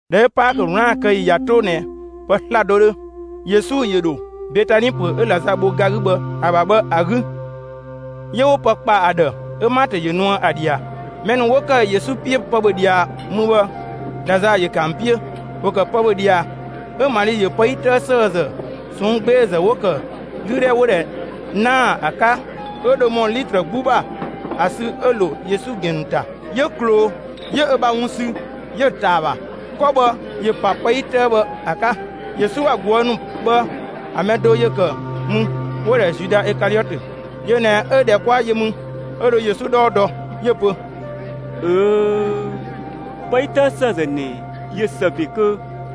꞊Dhɛ 'ö Paakö 'wlaan‑ kë ‑yi ꞊ya 'to ꞊nɛ pë 'slado 'dhö, Yesu ‑yö ‑dho Betani ‑pö 'ö Lazaa bho ga 'gü ‑a ‑bha bhë ‑a 'gü. 'Yö 'wo pë ‑kpa ‑a ‑dhë 'ö Maatö ‑yö nuë ‑a ꞊dhia. Mɛ ‑nu 'wo ‑kë Yesu 'piö pë ‑bhö ꞊dhia mü bhë, Lazaa ‑yö ‑kë ‑an 'piö. (‑Wo ‑kë pë ‑bhö ꞊dhia) 'ö Mali ‑yö pë 'yi 'tëë ‑sëëzë ꞊sɔnng' 'gbeezë 'wo‑ ‑kë 'lüdhɛ 'wo‑ ‑dhɛ 'naa‑ ‑a 'ka 'ö dho ‑mɔ litrë 'gbu ‑bha ‑a sü 'ö‑ ‑lo Yesu ‑gɛn ‑nu ‑ta. 'Yö ꞊kloo, 'yö ö ‑bha wun sü, 'yö‑ ꞊taa ‑a ‑bha. 'Kɔ bhë ‑yö ‑pa pë 'yi bhë ‑a 'tëë 'ka. Yesu ‑bha ꞊guë' ‑nu bhë ‑a mɛ do ‑yö ‑kë mü, 'wo‑ ‑dhɛ Zuda Ikaliɔtö. Yö ꞊nɛ 'ö ꞊dhɛ 'kwa yö mü, 'ö dho Yesu 'dhɔɔ dɔ. 'Yö‑ pö: «꞊Öööö', pë 'yi 'tëë ‑sëëzë ꞊nɛ ꞊yö ‑së ‑be kö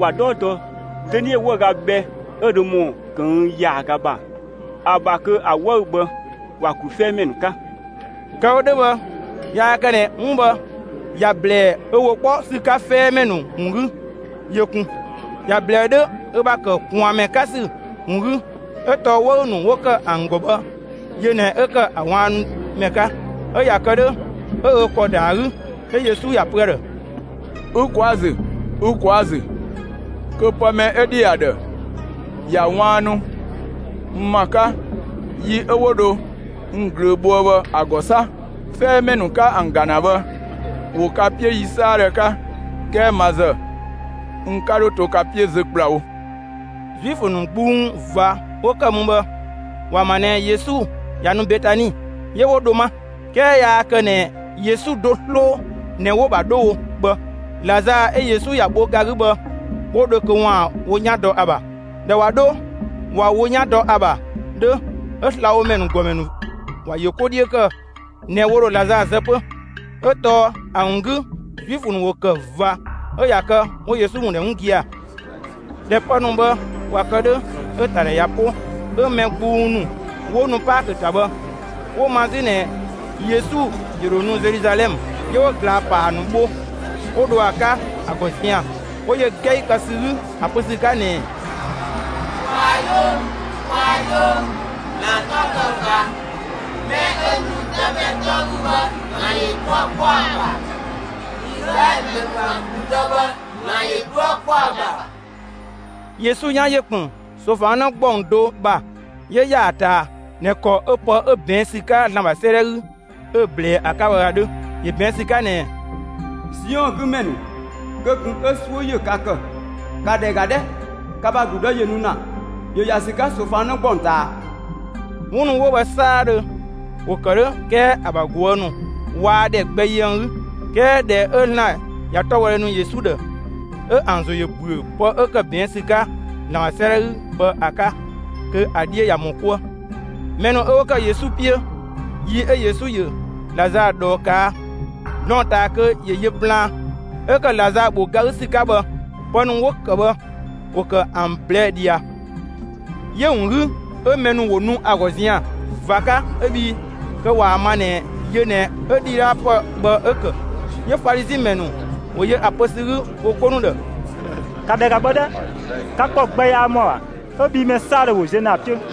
‑wa 'dhɔɔ dɔ dönie 'wëüga bhɛ 'ö dho ‑mɔ ꞊këng' ‑yaaga ‑bha ‑a ‑bha kö ‑a 'wëü‑ bhë ‑wa ‑glu 'fɛɛmɛ ‑nu 'ka.» Kë‑ wo 'dhö bhë yaa kë ꞊nɛ 'wun bhë ‑ya ‑blɛɛ ö ‑wo 'kpɔ ‑sü 'ka 'fɛɛmɛ ‑nu ‑wun 'gü yö kun! ‑Ya ‑blɛɛ 'dhö ö ‑bha ‑kë ꞊kwaanmɛ 'ka ‑sü ‑wun 'gü. 'Ö tɔɔ 'wëü‑ ‑nu 'wo ‑kë ‑an ‑gɔ bhë, yö ꞊nɛ 'ö ‑kë ‑a ꞊waannumɛ 'ka; 'ö ꞊ya kë 'dhö 'ö ö ‑kɔ ‑da ‑a 'gü. 'Yö Yesu ‑ya pö ‑a ‑dhë: «Ü ꞊kwaa' ‑a ‑zü! Ü ꞊kwaa' ‑a ‑zü kö pë mɛ 'ö ‑dhi ‑a ‑dhë ‑ya ꞊waannu n ‑ma 'ka yi 'ö 'wo dho n ꞊glöö bhoë bhë ‑a ‑gɔ 'sa! 'Fɛɛmɛ ‑nu 'ka ‑an ‑ga ‑na bhë, ‑wo ka 'piö yi 'saadhö 'ka; 'kɛɛ ma ‑zë, n 'ka 'dho to ka 'piö zö ‑kplawo.» Zuifö ‑nu gbung ꞊va 'wo ‑kë mü bhë, ‑wa ‑ma ꞊nɛ Yesu ꞊ya nu Betani. 'Yö 'wo dho 'ma. 'Kɛɛ yaa kë ꞊nɛ Yesu do 'sloo ꞊nɛ 'wo‑ ‑bha 'dho wo bhë; Lazaa 'ö Yesu ‑ya bho ga 'gü bhë 'wo dho kö ‑waan wo 'yan dɔ ‑a ‑bha. (꞊Dhɛ ꞊wa 'dho ꞊wa wo 'yan dɔ ‑a ‑bha 'dhö,) 'ö slabhomɛ ‑nu ‑gɔmɛ ‑nu ‑wa ‑yö 'ko 'dhiö ‑kë ꞊nɛ ‑wo ‑dho Lazaa zë 'pö, 'ö tɔɔ ‑a ‑wun 'gü Zuifö ‑nu ‑wo ‑kë ꞊va 'ö ꞊ya kë 'wo Yesu ‑wun ‑dhɛ 'wun gia‑. ꞊Dhɛ pë ‑nu bhë ꞊wa kë 'dhö, 'ö‑ ‑ta ‑dhɛ ꞊ya 'po, 'ö mɛ gbung ‑nu 'wo nu Paakö ‑ta bhë 'wo‑ ma 'zü ꞊nɛ Yesu ‑yö ‑dho nu Zeluzalɛmë. 'Yö 'wo ꞊glaa‑ ‑paa ‑nu bho, 'wo dho ‑a 'ka ‑a ‑gɔ zian‑. 'Wo yö 'gɛi kë ‑sü 'gü ‑a pö ‑sü 'ka ꞊nɛɛ: «Kwaa‑ 'yoo ‑mü! Kwaa‑ 'yoo ‑mü! ‑Zlan 'tɔ‑ kë ꞊va! Mɛ 'ö nu Dëmɛ 'tɔ 'gü bhë, ‑Zlan ‑yö 'dhuë‑ 'kpɔ ‑a ‑bha! Izlaɛlö ‑mɛ ‑nu ‑bha ‑gludë bhë, ‑Zlan ‑yö 'dhuë‑ 'kpɔ ‑a ‑bha!» Yesu 'yan ‑yö ‑kpën ꞊soofang 'në ‑gbɔng do ‑bha; 'yö ‑ya ‑a ꞊taa ꞊nɛ ‑kɔ 'ö pë 'ö ꞊bɛɛn' ‑sü 'ka ‑Zlan ‑bha 'sëëdhɛ 'gü 'ö‑ ꞊blɛɛ ‑a 'ka bhë ‑a 'dhö. ‑Yö ꞊bɛɛn' ‑sü 'ka ꞊nɛɛ: Siɔn 'gü ‑mɛ ‑nu, kö ꞊kun 'ö 'suö ‑yö ka ‑kë! ‑Ka ‑dhɛ ‑ga 'dhɛ, ka ‑bha ‑gludë ‑yö nu ‑na, ‑yö ‑ya ‑sü 'ka ꞊soofang 'në ‑gbɔng ꞊taa. 'Wun ‑nu 'wo bhë 'saadhö, ‑wo ‑kë 'dhö 'kɛɛ ‑a ‑bha ꞊guë' ‑nu waa ‑dhɛ gbɛ yö ‑an 'gü. 'Kɛɛ ꞊dhɛ 'ö ‑Zlan ꞊ya 'tɔbhɔdhe ‑nu Yesu ‑dhë, 'ö ‑an ‑zo ‑yö ‑büö pë 'ö ‑kë ꞊bɛɛn' ‑sü 'ka ‑Zlan ‑bha 'sëëdhɛ 'gü bhë ‑a 'ka, kö ‑a 'dhiö ꞊ya ‑mɔ 'kuë. Mɛ ‑nu 'ö 'wo ‑kë Yesu 'piö yi 'ö Yesu ‑yö Lazaa ꞊dhɔɔ ꞊kaa' blɔɔn‑ ꞊taa kö ‑yö yö plaan 'ö ‑kë Lazaa ‑bho ga 'gü ‑sü 'ka bhë, pë ‑nu 'wo ‑kë bhë ‑wo ‑kë ‑an ꞊blɛɛ' ꞊dhia. 'Yö‑ ‑wun 'gü 'ö mɛ ‑nu ‑wo nu ‑a ‑gɔ zian‑ ꞊va 'ka, 'ö bhii kö ꞊waa‑ ma ꞊nɛ yö ꞊nɛ 'ö ‑dhidhaapë bhë 'ö‑ ‑kë. 'Yö Falizi ‑mɛ ‑nu ‑wo yö ‑a pö ‑sü 'gü wo 'ko ‑nu ‑dhë: «‑Ka ‑dhɛ ‑ga bhë 'dhɛ, ka ‑kɔ gbɛ yaa ‑mɔa ‑bha 'ö bhii mɛ 'saadhö ‑wo ziö ‑na ‑a 'piö!»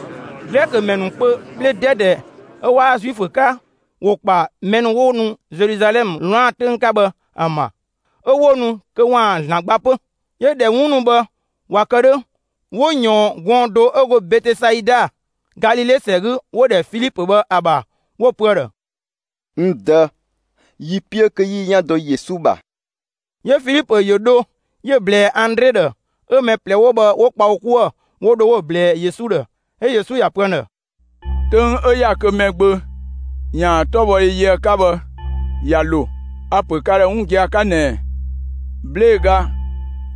Glɛkö ‑mɛ ‑nu kpö 'bhle 'dɛdɛ 'ö waa kë Zuifö 'ka ‑wo ‑kpa mɛ ‑nu 'wo ‑nu Zeluzalɛmë 'wlaan‑ 'töng 'ka bhë ‑an ‑bha, 'ö 'wo nu kö ‑waan ‑Zlan gba 'pö. 'Yö ꞊dhɛ 'wun ‑nu bhë ꞊wa kë 'dhö, 'wo ꞊yɔɔn gɔɔn‑ do 'ö go Betesaida, Galile ‑sɛ 'gü, 'wo‑ ‑dhɛ Filipö bhë ‑a ‑bha, 'wo‑ pö ‑a ‑dhë: «N Dë, yi‑ 'piö kö 'yi yi 'yan dɔ Yesu ‑bha.» 'Yö Filipö ‑yö dho 'yö‑ ꞊blɛɛ Andre ‑dhë, 'ö mɛ ꞊plɛ 'wo bhë 'wo kpa wo 'kuë‑ 'wo dho 'wo‑ ꞊blɛɛ Yesu ‑dhë. 'Ö Yesu ‑ya pö ‑an ‑dhë: «'Töng 'ö ‑ya kö Mɛgbö ‑yaan 'tɔbhɔdhe yö ‑a 'ka bhë ꞊ya ‑lo. A‑ ‑pö ka ‑dhë 'wun gia‑ 'ka ꞊nɛɛ: 'Blee‑ ga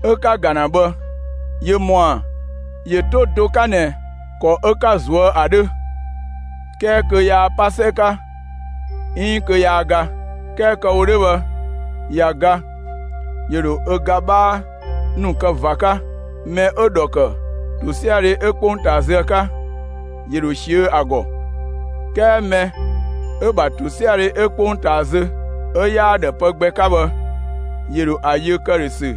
'ö 'ka‑ ‑ga ‑na bhë ‑yö ‑mɔa ‑yö 'to do 'ka ꞊nɛ ‑kɔ 'ö 'ka‑ suö ‑a 'dhö; 'kɛɛ kö yaa 'pa 'sɛ 'ka, 'iin kö yaa ga. 'Kɛɛ kë‑ wo 'dhö bhë ꞊ya ga, ‑yö ‑dho ö ga 'bhaa ‑nu kë ꞊va 'ka. Mɛ 'ö‑ ‑dhɔ ‑kë ‑tosiadhe 'ö 'kpongtaa zö ‑a 'ka, ‑yö ‑dho ꞊siö'‑ ‑a ‑gɔ; 'kɛɛ mɛ 'ö‑ ‑bha ‑tosiadhe 'ö 'kpongtaa zö, 'ö 'yaa‑ ‑dhë pë gbɛ 'ka bhë, ‑yö ‑dho ‑a yö ‑këdhösü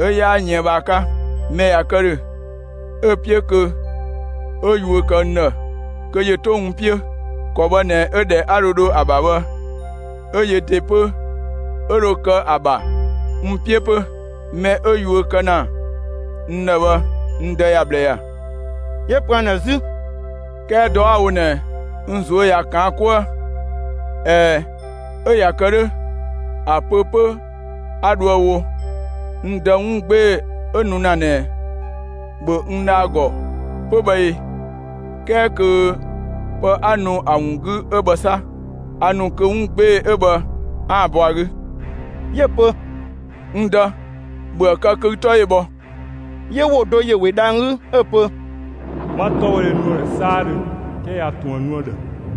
'ö‑ 'yaa yën bhë ‑a 'ka. Mɛ ꞊ya kë ‑dhö, 'ö‑ 'piö kö 'ö yuö kë n ‑dhë, kö ‑yö 'to n 'piö. ‑Kɔ bhë ꞊nɛ 'ö ‑dhɛ 'a dho dho ‑a ‑bha bhë, 'ö yö ‑de 'pö 'ö dho kë ‑a ‑bha n 'piö 'pö. Mɛ 'ö yuö kë ‑na n ‑dhë bhë, n Dë ‑ya ꞊bhlë ‑ya.» 'Yö‑ pö ‑an ‑dhë 'zü: «'Kɛɛ dɔ 'a‑ wo ꞊nɛ, n ꞊zuö' ꞊ya ꞊kaan' 'kuë. ꞊Ɛɛ, 'ö ꞊ya kë 'dhö, ‑a pö 'pö 'a dhoë‑ wo: N Dë, 'wun 'gbee‑ 'ö nu ‑na ꞊nɛ, ‑bhö n dha ‑a ‑gɔ 'pö bhë ee? 'Kɛɛ kö pë 'a nu ‑a ‑wun 'gü 'ö bhë 'sa! A ‑nu kö 'wun 'gbee‑ 'ö bhë 'aan‑ bɔ ‑a 'gü.» 'Yö‑ pö: «N Dë, ‑bhöë kë kö ü 'tɔ ‑yö bhɔ!» 'Yö ‑wo do ‑yö we dhang‑ 'gü 'ö‑ pö: «'Ma 'tɔbhɔdhe nu ‑a ‑dhë 'saadhö, 'kɛɛ a ꞊tun ‑a nu ‑a ‑dhë.»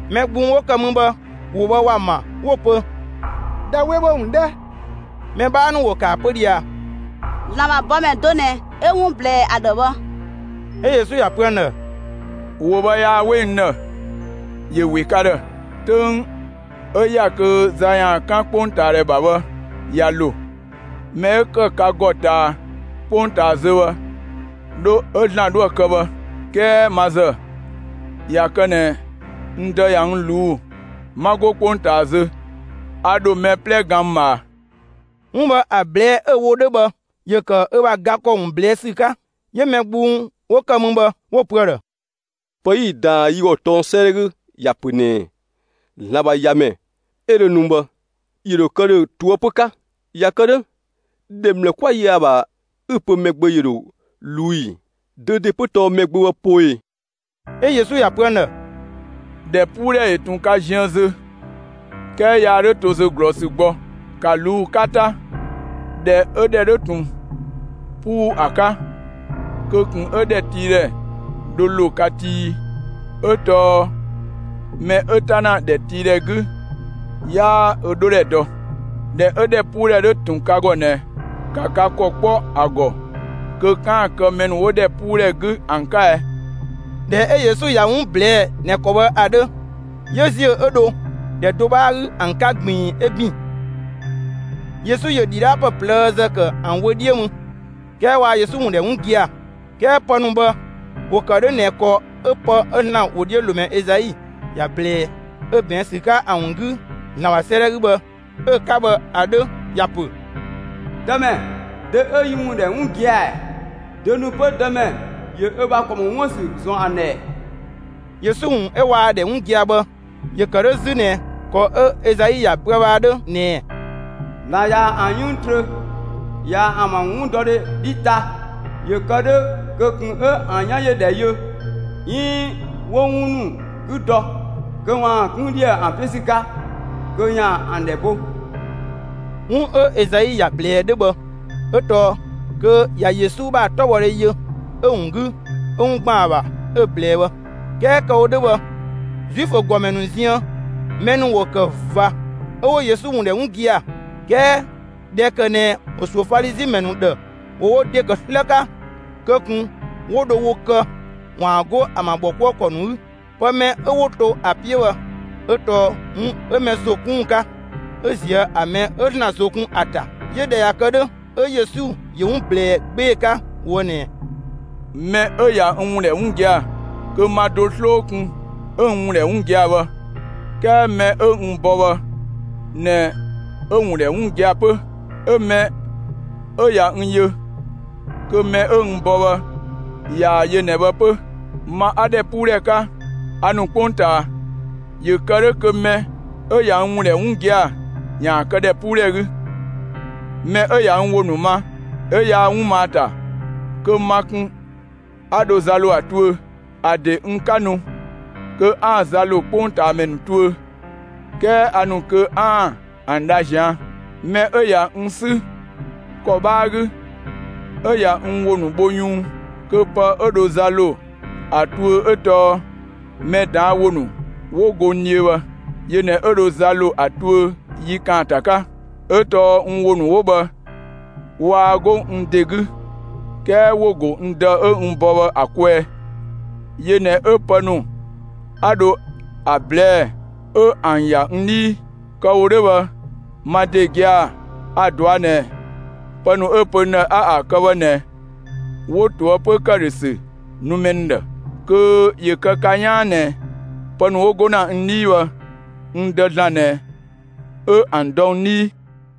Mɛ gbung 'wo ‑kë mü bhë ‑wo bhë ‑wa ‑ma; 'wo‑ pö: «Dha 'we ‑wo ‑mü 'dhɛ!» Mɛ 'bhaa ‑nu ‑wo ‑kë ‑a pö ꞊dhia: «‑Zlan ‑bha bɔmɛ do ꞊nɛ 'ö 'wun ꞊blɛɛ ‑a ‑dhë bhë!» 'Ö Yesu ‑ya pö ‑an ‑dhë: «‑Wo bhë yaa 'we n ‑dhë; ‑yö ‑we ka ‑dhë. 'Töng 'ö ‑ya kö za ‑yaan 'kan 'kpongtaadhɛ ‑bha bhë ꞊ya ‑lo. Mɛ 'ö ‑kë ka ‑gɔ ꞊taa 'kpongtaa zö bhë, 'dho 'ö ‑Zlan 'dhoë‑ kë bhë. 'Kɛɛ ma ‑zë, ꞊ya kë ꞊nɛ n Dë ꞊ya n ꞊luu'‑, 'ma 'go 'kpongtaa zö, a ‑dho mɛ 'plɛ gan n ꞊bhaa.» 'Wun bhë ‑a ꞊blɛɛ' 'ö‑ wo 'dhö bhë ‑yö ‑kë ö ‑bha ga ‑kɔ ‑wun ꞊blɛɛ' ‑sü 'ka. 'Yö mɛ gbung 'wo ‑kë mü bhë, 'wo‑ pö ‑a ‑dhë: «Pë 'yi‑ ꞊daan yi ‑gɔ tɔng 'sëëdhɛ 'gü ‑ya ‑pö ꞊nɛɛ ‑Zlan ‑bha ‑Yamɛ 'ö dho nu bhë, ‑yö ‑dho kë ‑dhö ꞊toëpö 'ka. ꞊Ya kë 'dhö, ‑dhɛ ‑mlë 'kwa yö ‑a ‑bha 'ü‑ pö Mɛgbö ‑yö ‑dho ꞊luu' ꞊ii? Dö ‑de 'pö tɔɔ Mɛgbö bhë poo ꞊ee?» 'Ö Yesu ‑ya pö ‑an ‑dhë: «‑Dhɛpuudhɛ ‑yö ꞊tun ka ziën zö; 'kɛɛ yaa 'dho to zö ꞊glɔɔsü gbɔ. ‑Ka ꞊luu' 'ka 'ta, ꞊dhɛ 'ö ‑dhɛ 'dhö ꞊tun 'puu ‑a 'ka, ꞊kun ‑kë 'ö ‑dhɛtiidhɛ dhö ‑lo ka tii ꞊ii. 'Ö tɔɔ mɛ 'ö 'ta ‑na ‑dhɛtiidhɛ 'gü, 'yaa ö 'dhodhɛ dɔ. ꞊Dhɛ 'ö ‑dhɛpuudhɛ 'ö ꞊tun ka ‑gɔ ꞊nɛ, ‑ka ka ‑kɔ 'kpɔ ‑a ‑gɔ kö 'kaan‑ kë mɛ ‑nu 'wo ‑dhɛpuudhɛ 'gü ‑an 'ka ɛ.» ꞊Dhɛ 'ö Yesu ꞊ya 'wun ꞊blɛɛ'‑ ꞊nɛ ‑kɔ bhë ‑a 'dhö, 'yö ‑ziö 'ö dho ‑dhɛ do 'bhaa 'gü ‑an 'ka ꞊gbiin, 'ö ‑bin. Yesu ‑yö ‑dhidhaapë ꞊plëëzë ‑kë ‑an wö 'dhiö mü, 'kɛɛ waa Yesu ‑wun ‑dhɛ 'wun gia‑; 'kɛɛ pë ‑nu bhë ‑wo ‑kë 'dhö ꞊nɛ ‑kɔ 'ö‑ pë 'ö ‑Zlan ‑wodhiölomɛ Ezai ‑ya ꞊blɛɛ 'ö ꞊bɛɛn' ‑sü 'ka ‑a ‑wun 'gü ‑Zlan ‑bha 'sëëdhɛ 'gü bhë, 'ö‑ 'ka bhë ‑a 'dhö. ‑Ya ‑pö: Dëmɛ, dö 'ö yi ‑wo ‑nu ‑dhɛ 'wun gia‑ ‑ɛɛ? Dö ‑nu 'pö Dëmɛ ‑yö ö ‑bha ‑kɔ ‑mɔ 'wuën‑ ‑sü ‑zɔn ‑an ‑dhë ‑ɛɛ? Yesu ‑wun 'ö waa‑ ‑dhɛ 'wun gia‑ bhë ‑yö ‑kë 'dhö 'zü ꞊nɛ ‑kɔ 'ö Ezai ‑ya pöë bhë ‑a 'dhö ꞊nɛɛ: ‑Zlan ꞊ya ‑an 'yënng trö, ꞊ya ‑an ‑bha 'wundɔdhe 'dhi ta, ‑yö kë 'dhö kö ꞊kun 'ö ‑an 'yan ‑yö ‑dhɛ yö 'iin 'wo 'wun ‑nu 'gü dɔ, kö ‑waan 'kun ‑dhië ‑an 'piö ‑sü 'ka, kö ‑yaan ‑an ‑dhɛ bo. 'Wun 'ö Ezai ‑ya ꞊blɛɛ 'dhö bhë 'ö tɔɔ kö ꞊ya Yesu ‑bha 'tɔbhɔdhe yö; 'ö‑ ‑wun 'gü 'ö 'wun ‑gban ‑a ‑bha 'ö‑ ꞊blɛɛ bhë. 'Kɛɛ kë‑ wo 'dhö bhë, Zuifö ‑gɔmɛ ‑nu ziën, mɛ ‑nu ‑wo ‑kë ꞊va 'ö 'wo Yesu ‑wun ‑dhɛ 'wun gia‑. 'Kɛɛ ꞊dhɛ ‑kë ꞊nɛ ‑wo ‑suö Falizi ‑mɛ ‑nu ‑dhë, ‑wo wo ‑de ‑kë 'slë 'ka, kö ꞊kun 'wo dho wo kë ‑waan 'go ‑an ‑bha ‑bhɔkuëkɔ ‑nu 'gü. Pë mɛ 'ö 'wo to ‑a 'piö bhë 'ö tɔɔ 'wun 'ö mɛ ‑zo 'kun ‑wun 'ka 'ö ꞊zië' ‑a mɛ 'ö ‑Zlan ‑zo kun ‑a ‑ta. 'Yö ꞊dhɛ ꞊ya kë 'dhö, 'ö Yesu ‑yö 'wun ꞊blɛɛ 'gbee‑ 'ka ꞊woë' ꞊nɛɛ: «Mɛ 'ö ꞊ya n ‑wun ‑dhɛ 'wun gia‑ kö ma do 'sloo kun 'ö n ‑wun ‑dhɛ 'wun gia‑ bhë; 'kɛɛ mɛ 'ö n bɔ bhë ꞊nɛ 'ö‑ ‑wun ‑dhɛ 'wun gia‑ 'pö. 'Ö mɛ 'ö ꞊ya n yö, kö mɛ 'ö n bɔ bhë ꞊yaa‑ yö ꞊nɛ bhë 'pö. Ma 'a ‑dhɛpuudhɛ 'ka, a ‑nu 'kpongtaa, ‑yö kë 'dhö kö mɛ 'ö ꞊ya n ‑wun ‑dhɛ 'wun gia‑ ‑yaan kë ‑dhɛpuudhɛ 'gü. Mɛ 'ö ꞊ya n ‑wo ‑nu ma 'ö yaa 'wun ma ‑a ‑ta, kö ma kun 'a dho za ‑lo ‑a tuö; ‑a ‑de n 'ka nu kö 'aan‑ za ‑lo 'kpongtaamɛ ‑nu tuö, 'kɛɛ a ‑nu kö 'aan‑ ‑an dha ꞊zian'. Mɛ 'ö ꞊ya n 'sü ‑kɔ 'bhaa 'gü, 'ö ꞊ya n ‑wo ‑nu bho yunng kö pë 'ö dho za ‑lo ‑a tuö 'ö tɔɔ mɛ ꞊daan' ‑wo ‑nu 'wo go n dhiö bhë. Yö ꞊nɛ 'ö dho za ‑lo ‑a tuö yi ‑kaanta 'ka. 'Ö tɔɔ n ‑wo ‑nu 'wo bhë waa 'go n ‑de 'gü, 'kɛɛ ‑wo ‑go n Dë 'ö n bɔ bhë ‑a kwɛɛ. Yö ꞊nɛ 'ö pë ‑nu 'a dho ‑a ꞊blɛɛ' 'ö ‑an ‑ya n 'dhii. Kë‑ wo 'dhö bhë, ma ‑de gia‑ a‑ ꞊dɔa' ꞊nɛ pë ‑nu 'ö‑ pö n ‑dhë 'a ‑an kë bhë ꞊nɛ 'wo ꞊toëpö ‑këdhösü nu mɛ ‑nu ‑dhë. Kö ‑yö kë ka 'yaan ꞊nɛ pë ‑nu 'wo go ‑na n 'dhii bhë, n Dë (‑Zlan) ꞊nɛ 'ö ‑an dɔ n 'dhii.»